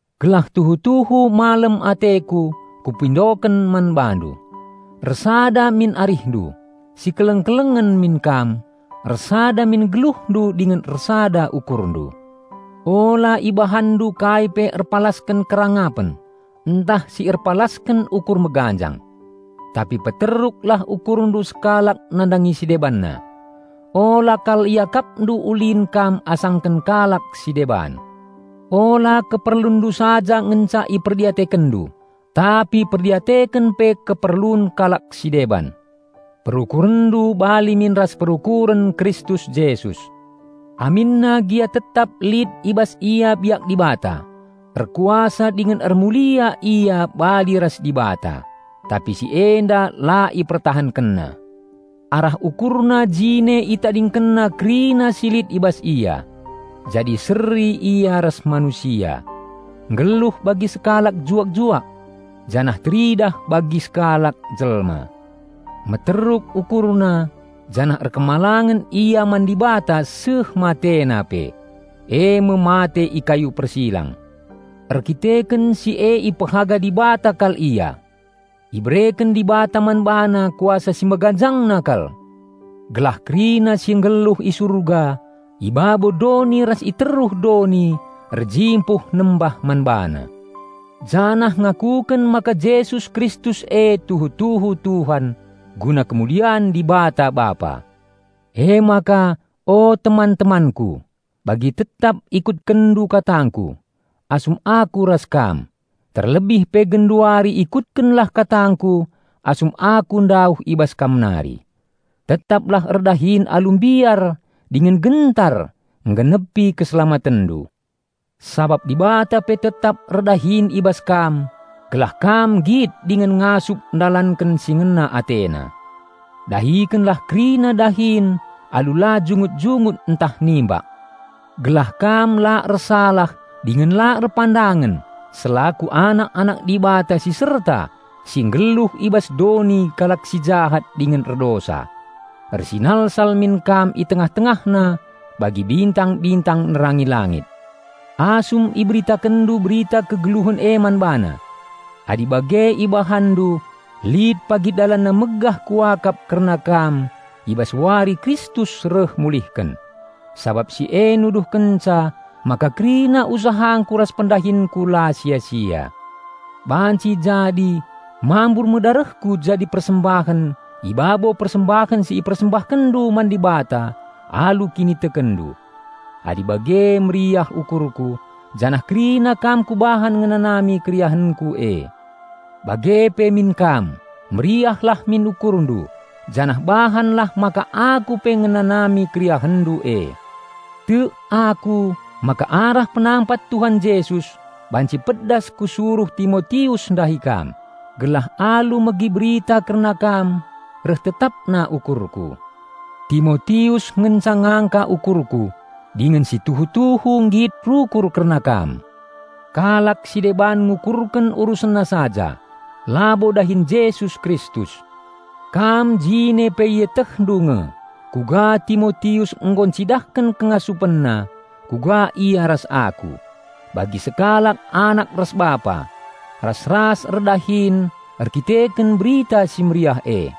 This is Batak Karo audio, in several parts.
Gelah tuhu-tuhu malem ateku, kupindoken man bandu: Ersada min arihndu, sikeleng-kelengen min kam, ersada min geluhndu dingen ersada ukurndu. Ula ibahanndu kai pe erpalasken kerangapen, ntah si erpalasken ukur meganjang. Tapi peteruklah ukurndu sekalak nandangi si debanna. Ula kal iakapndu ulin kam asangken kalak si deban. Ula keperlunndu saja ngenca iperdiatekenndu tapi perdiateken pe keperlun kalak si deban. Perukurenndu bali min ras perukuren Kristus Jesus: Aminna gia tetap lit i bas Ia biak Dibata, erkuasa dingen ermulia Ia bali ras Dibata, tapi si enda la IpertahankenNa. Arah ukurna jine ItadingkenNa kerina si lit i bas Ia. Jadi seri Ia ras manusia; nggeluh bagi sekalak juak-juak. Janah teridah bagi sekalak jelma. Meteruk UkurNa, janah patuh Ia man Dibata seh matena pe; eme mate i kayu persilang. Erdandanken si e ipehaga Dibata kal Ia. Ibereken Dibata man BaNa kuasa si meganjangna kal. Gelah kerina si enggeluh i Surga, i babo doni ras i teruh doni erjimpuh nembah man BaNa. Janah ngakuken maka Jesus Kristus e tuhu-tuhu Tuhan, guna kemulian Dibata Bapa. Emaka, o teman-temanku, bagi tetap ikutkenndu katangku, asum aku ras kam, terlebih pe genduari ikutkenlah katangku asum aku ndauh i bas kam nari. Tetaplah erdahin alu mbiar dingen gentar enggenepi keselamatenndu. Sabap Dibata pe tetap erdahin i bas kam gelah kam nggit dingen ngasup ndalanken si ngena AteNa. Dahikenlah kerina dahin alu la jungut-jungut ntah nimbak. Gelah kam la ersalah dingen la erpandangen selaku anak-anak Dibata si serta si nggeluh i bas doni kalak si jahat dingen erdosa. Ersinalsal min kam i tengah-tengahna bagi bintang-bintang nerangi langit. Asum iberitakenndu Berita Kegeluhen e man bana. Adi bage ibahanndu lit pagi dalanna megah kuakap kerna kam i bas Wari Kristus reh mulihken, sabap si e nuduhkenca maka kerina usahangku ras pendahinku la sia-sia. Banci jadi mambur me darehku jadi persembahen i babo persembahen si ipersembahkenndu man Dibata alu kinitekenndu. Adi bage meriah ukurku, janah kerina kam kubahan ngenanami keriahenku e. Bage pe min kam, meriahlah min ukurndu, janah bahanlah maka aku pe ngenanami keriahenndu e. Tek aku maka arah penampat Tuhan Jesus banci pedas kusuruh Timotius ndahi kam, gelah alu megi berita kerna kam reh tetapna ukurku. Timotius ngenca ngangka ukurku dingen si tuhu-tuhu nggit rukur kerna kam. Kalak si deban ngukurken urusenna saja, labo dahin Jesus Kristus. Kam jine pe ietehndu nge kuga Timotius nggo ncidahken kengasupenna, kuga ia ras aku, bagi sekalak anak ras bapa, ras-ras erdahin erdandanken Berita Si Mehuli e.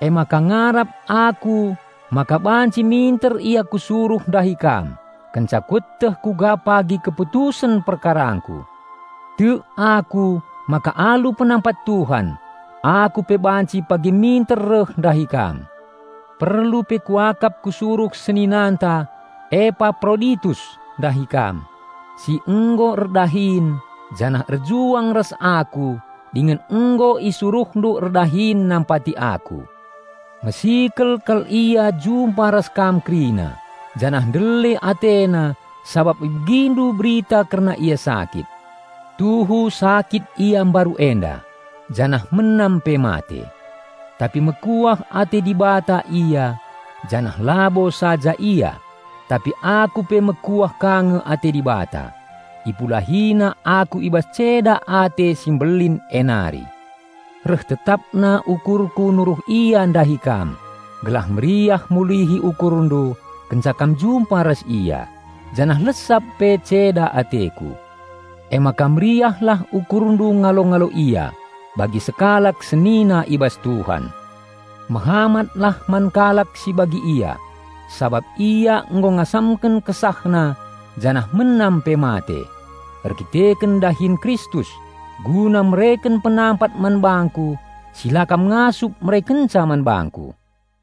Emaka ngarap aku maka banci minter ia kusuruh ndahi kam, kenca kueteh kuga pagi keputusen perkarangku. Tek aku maka alu penampat Tuhan, aku pe banci pagi minter reh ndahi kam. Perlu pe kuakap kusuruh seninanta Epaproditus ndahi kam, si nggo erdahin janah erjuang ras aku dingen nggo isuruhndu erdahin nampati aku. Mesikel kal ia jumpa ras kam kerina janah ndele atena sabap ibegindu berita kerna ia sakit. Tuhu sakit ia mbaru enda, janah menam pe mate. Tapi mekuah ate Dibata ia; janah labo saja ia, tapi aku pe mekuah ka nge ate Dibata, IpulahiNa aku i bas ceda ate si mbelin e nari. Reh tetapna ukurku nuruh ia ndahi kam gelah meriah mulihi ukurndu kenca kam jumpa ras ia, janah lesap pe ceda ateku. Emaka meriahlah ukurndu ngalo-ngalo ia, bagi sekalak senina i bas Tuhan. Mehamatlah man kalak si bagi ia, sabap ia nggo ngasamken kesahna janah menam pe mate, erdandanken dahin Kristus, guna mereken penampat man bangku si la kam ngasup merekenca man bangku.